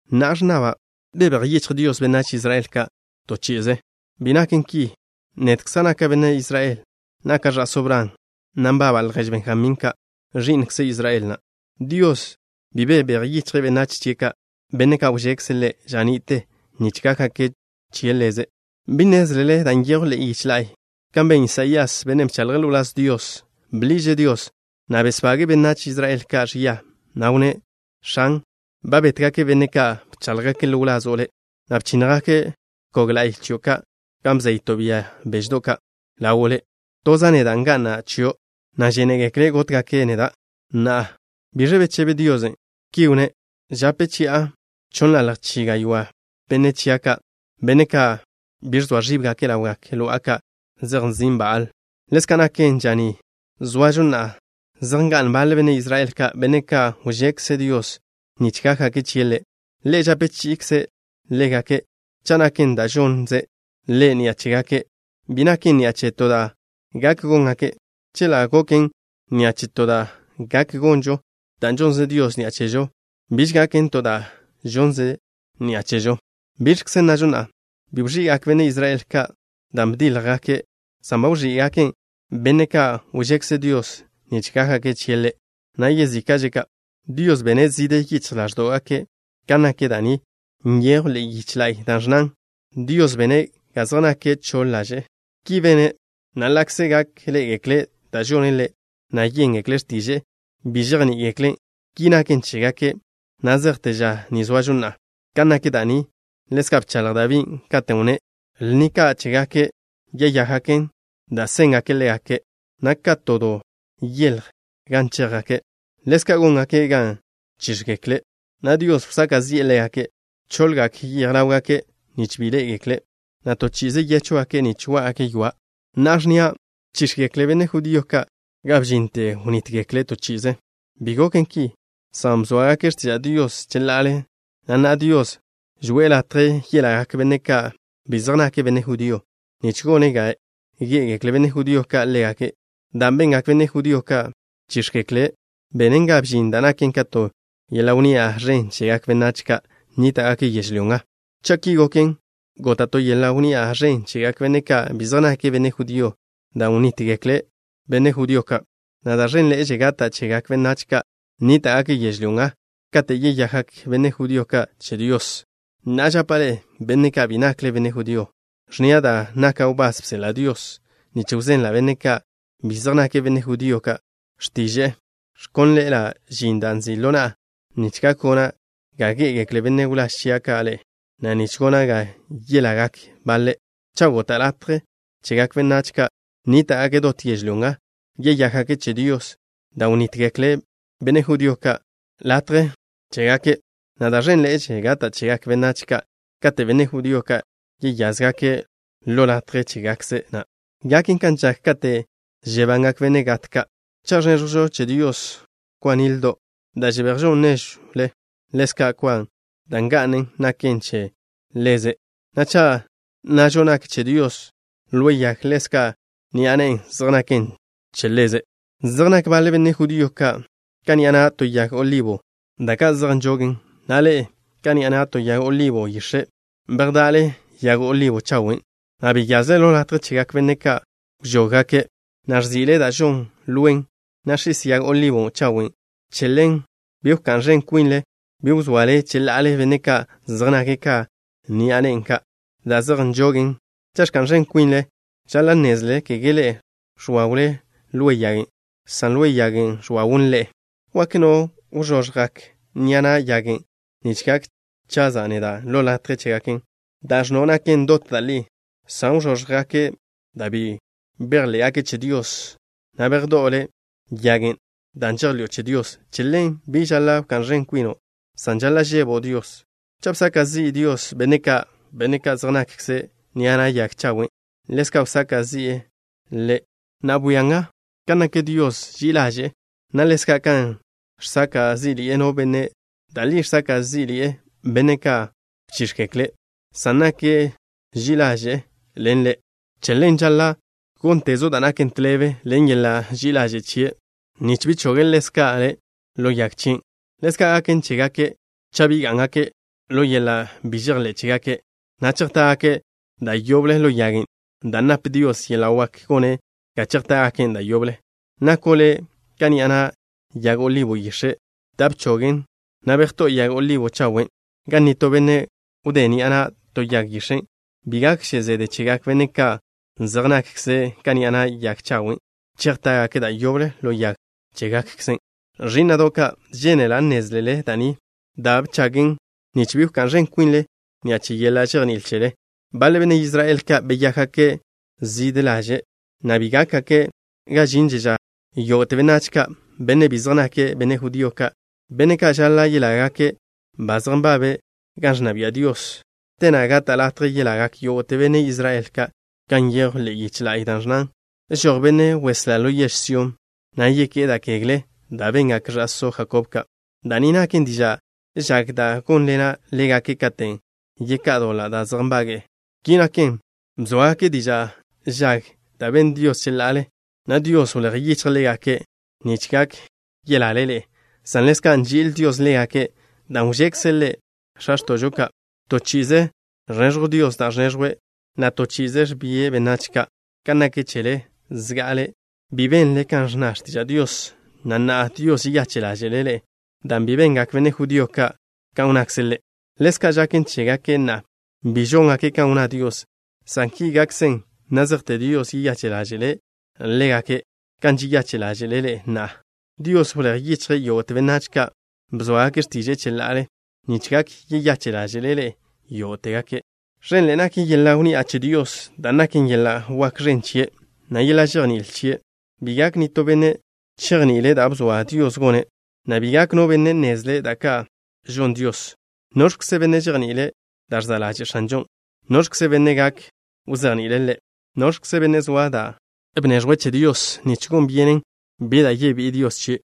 Na'a ẕnnaba': ¿Bebéj yichj Dios benách Israel ka' to chi'ize? Bi naken ki. Nedkza' naka' benne' Israel. Naka' ẕa'só Bran, na' nbaba' ljež Benjamín ka', ẕi'nkze Israel na'. Dios bi bebéj yichje' benách chie' ka', benne' ka' wžekze' Ḻe' ža ni'te nich gákgake' che Ḻeze'. ¿Bi nnézlele dan' nyejw ḻe'e yiche la'y kan ben Lías, bennen' bchaḻje' ḻo wláz Dios? Bḻiže' Dios, na' besbage'e benách Israel ka' ẕia, na' wnné': “X̱an, ba bétgake' benne' ka' bcháḻjgake' ḻo wlazo' Le', na' bchínnjgake' bkog la'y chio' ka' gan bzeyto' bia beždo' ka' ḻawo' Le'. Toza' neda' nga'na' chio', na' žénegekle' gótgake' neda'.” Na'a, ¿biẕ bechebe Dios? Ki wnné': “Žape chi'a chonnḻalj chi gaywá' benne' chia' ka', benne' ka' bi ẕzoa ẕíbgake' ḻawgak lo'a ka' zej nzin' Baal.” Ḻezka' naken ža ni zoažo na'a, zej nga'n baḻe benne' Israel ka', benne' ka' wžekze Dios nich gákgake' chie' Ḻe'. Ḻe' žape chi'ikze' ḻégake'. Cha' naken da' žonze' Ḻe' ni'a chégake', bi naken ni'a che to da' gak góngake'. Chela' goken ni'a che to da' gak gonžo, dan' žonze Dios ni'a chežo biž gaken to da' žonze' ni'a chežo. ¿Biẕkze nnažo na'a? Bi wẕi'gak benne' Israel ka' dan' bdíljgake', san ba wẕí'gaken benne' ka' wžekze Dios nich gákgake' chie' Ḻe', na' yezíka'že' ka', Dios bene' zižje yichj ḻáẕdo'gake'. Kan nak da' ni nyejw ḻe'e yiche la'y da' ẕnnan: “Dios bene' ga zej nake' choḻ ḻaže'.” Ki bene', na' ḻa'kze gak ḻé'egekle' da' žone' Ḻe', na' yéngekle' x̱tiže'e, bi žejní'igekle'. Ki naken chégake' na' zejte ža ni zoažo na'a. Kan nak da' ni ḻezka' bchaḻj Dabí, katen' wnné': Lni ka' chégake' yeyákgaken da' séngaken ḻégake', na' ka to do yeḻj gan chéjgake'. Ḻezka' góngaken ga chíx̱gekle', na' Dios wsaka' zi'e ḻégake'. Choḻgak yej ḻáwgake', nich bi ḻé'egekle', na' to chi'ize yéchwgake' nich wá'gake' ywa'. Na'a ẕnnia': ¿Bchíx̱gekle benne' judío ka' ga bžinte wnítgekle' to chi'ize? Bi goken ki, san bzóagake' x̱tiža' Dios cheḻa'ale, na' na'a Dios žoe'e latje yelagak benne' ka' bi zej nake' benne' judío nich gone' ga gé'egekle benne' judío ka' ḻégake'. Dan' bengak benne' judío ka', bchíx̱gekle', benen ga bžin da' naken ka to yeḻa' wnni'a ẕen chegak benách ka' nníta'gake' yežlyó nga. Cha' ki goken, gota' to yeḻa' wnni'a ẕen chegak benne' ka' bi zej nake' benne' judío dan' wnítgekle benne' judío ka', na' da' ẕenḻe'eže gata' chegak benách ka' nníta'gake' yežlyó nga kate' yeyakgak benne' judío ka' che Dios. Na'a žapa' ḻe'e, benne' ka' bi nakle benne' judío, ẕnnia': dan' naka' wbás bseḻa' Dios nich wzenla' benne' ka' bi zej nake' benne' judío ka' x̱tiže'e, ẕkónḻe'ela' žin dan' nzi' ḻo na'a, nich gak gona' ga gé'egekle benne' wláž chia' ka' ḻe'e, na' nich gona' ga yelágake' baḻe'. Cha' gota' latje chegak benách ka' nníta'gake' dot yežlyó nga yeyákgake' che Dios dan' wnítgekle benne' judío ka' latje chégake', na' da' ẕénḻe'eže gata' chegak benách ka', kate' benne' judío ka' yeyázgake' ḻo latje chégakkze' na'. Gaken kan žak kate' žebangak benne' gat ka'. Cha' ẕnéẕjwžo che Dios kwa nildo' da' žebejžon néžwle, ḻezka' kwa dan' nga'nen naken che Ḻeze', na' cha' nnažo nak che Dios lwe yag, ḻezka' ni'a nen zej naken che Ḻeze'. Zej nak baḻe benne' judío ka' ka ni'a na' to yag olibo chawe' da' ka' zej nžogen, na' ḻe'e, ka ni'a na' to yag olibo yix̱e', bejda'le yag olibo chawen', na' beyazle ḻo latje chegak benne' ka' wžóggake', na' ẕzi'le da' žonn lwen, na' x̱is yag olibo chawen'. Che ḻen, bi wká'n ẕen kwinle, bi wzoale cheḻa'ale benne' ka' zej nake' ka ni'a nen ka', da' zej nžogen. Cha' ẕka'n ẕen kwinle, žaḻa' nnézlele kege ḻe'e ẕwawle lwe yagen', san lwe yagen' ẕwawn ḻe'e. Wak nno': “Wžoggak ni'a na' yagen' nich gak chaza' neda' ḻo latje chégaken.” Da' ẕnno' naken dot da' li, san wžóggake' dan' bi bejḻé'gake' che Dios, na' bejdó'o le' yagen' dan' žejḻi'o che Dios. Che ḻen, bi žaḻa' wká'n ẕen kwino', san žaḻa' žebo' Dios. Cha' bsaka' zi'i Dios benne' ka', benne' ka' zej nakkze' ni'a na' yag chawen', ḻezka' wsaka' zi'e le'. Na'a, bwia nga kan nak Dios ži'i ḻaže', na' ḻezka' kan žsaka' zí'ḻi'e no benne'. Da' li žsaka' zí'ḻi'e benne' ka' bchíx̱gekle', san nake' ži'i ḻaže' ḻen le'. Che ḻen, žaḻa' góntezo' da' naken tḻebe ḻen yeḻa' ži'i ḻaže' chie' na', nich bi choge' ḻezka' le' ḻo yag chien'. Ḻezka' gaken chégake' cha' bi gá'ngake' ḻo yeḻa' bi žejḻé' chégake', na' chejtá'gake' da' yoble ḻo yagen', dan' nap Dios yeḻa' wak gone' ga chejtá'gaken' da' yoble. Nako' le' ka ni'a na' yag olibo yix̱e' da' bchogen', na' bejtó'o yag olibo chawen' gan nitó benne' wdé' ni'a na' to yag yix̱e'. Bi gakže zede chegak benne' ka' zej nakkze' ka ni'a na' yag chawen', chejtá'gake' da' yoble ḻo yag chégakkzen'. Ẕí'na'do' ka', žénela' nnézlele da' ni da' bgachen', nich bi wká'n ẕen kwinle ni'a che yeḻa' žejní'il chele. Baḻe benne' Israel ka' beyákgake' zižje ḻaže', na' ki gákgake' ga žinže ža yógo'te benách ka', benne' bi zej nake' benne' judío ka', benne' ka' žaḻa' yelágake', ba zej nbabe' gan ẕnna bia' Dios. Te na' gata' latje yelagak yógo'te benne' Israel ka', kan nyejw ḻe'e yiche la'y, da' ẕnnan: Žoj Benne' Weslá ḻo yež Sión, na' yeké'e da' kegle da' bengak ẕa'só Jakob ka'. Da' ni naken diža' žag da' gónḻena' ḻégake' katen' yeká'a doḻa' da' zej nbage'e. Ki naken, bzóagake' diža' žag da' ben Dios cheḻa'ale, na' Dios wléj yichje' ḻégake' nich gak yelale ḻe'e, san ḻezka' nži'il Dios ḻégake', dan' wžekze' Ḻe' x̱a x̱tó'gake' ka'. To chi'ize ẕneẕjw Dios da' ẕneẕjwe', na' to chi'ize ẕbie' benách ka'. Kan nak chele, zga'ale bi benle kan ẕnna x̱tiža' Dios, na' na'a Dios žeyache' ḻáže'le' ḻe'e dan' bi bengak benne' judío ka' kan wnnakze' Ḻe'. Ḻezka' žaken chégake' na'a, bi žóngake' kan wnná Dios, san ki gakzen na' zejte Dios yeyache' ḻáže'le' ḻégake', kan žeyache' ḻáže'le' ḻe'e na'a. Dios wléj yichje' yógo'te benách ka' bzóagake' x̱tiže'e cheḻa'ale, nich gak yeyache' ḻáže'le' yógo'tegake'. Ẕenḻe'e nak yeḻa' wnni'a che Dios, dan' naken yeḻa' wak ẕen chie', na' yeḻa' žejní'il chie'. Bi gak nitó benne' chejni'ile' da' bzoa Dios gone', na' bi gak no benne' nnezle' da' ka' žon Dios. ¿Noẕkze benne' žejni'ile' da' ẕza' ḻaže' X̱anžon'? ¿Noẕkze benne' gak wzejni'ile' Ḻe'? ¿Noẕkze benne' zoa da' bneẕjwe' che Dios nich gon byenen bi da' yebí'i Dios chie'?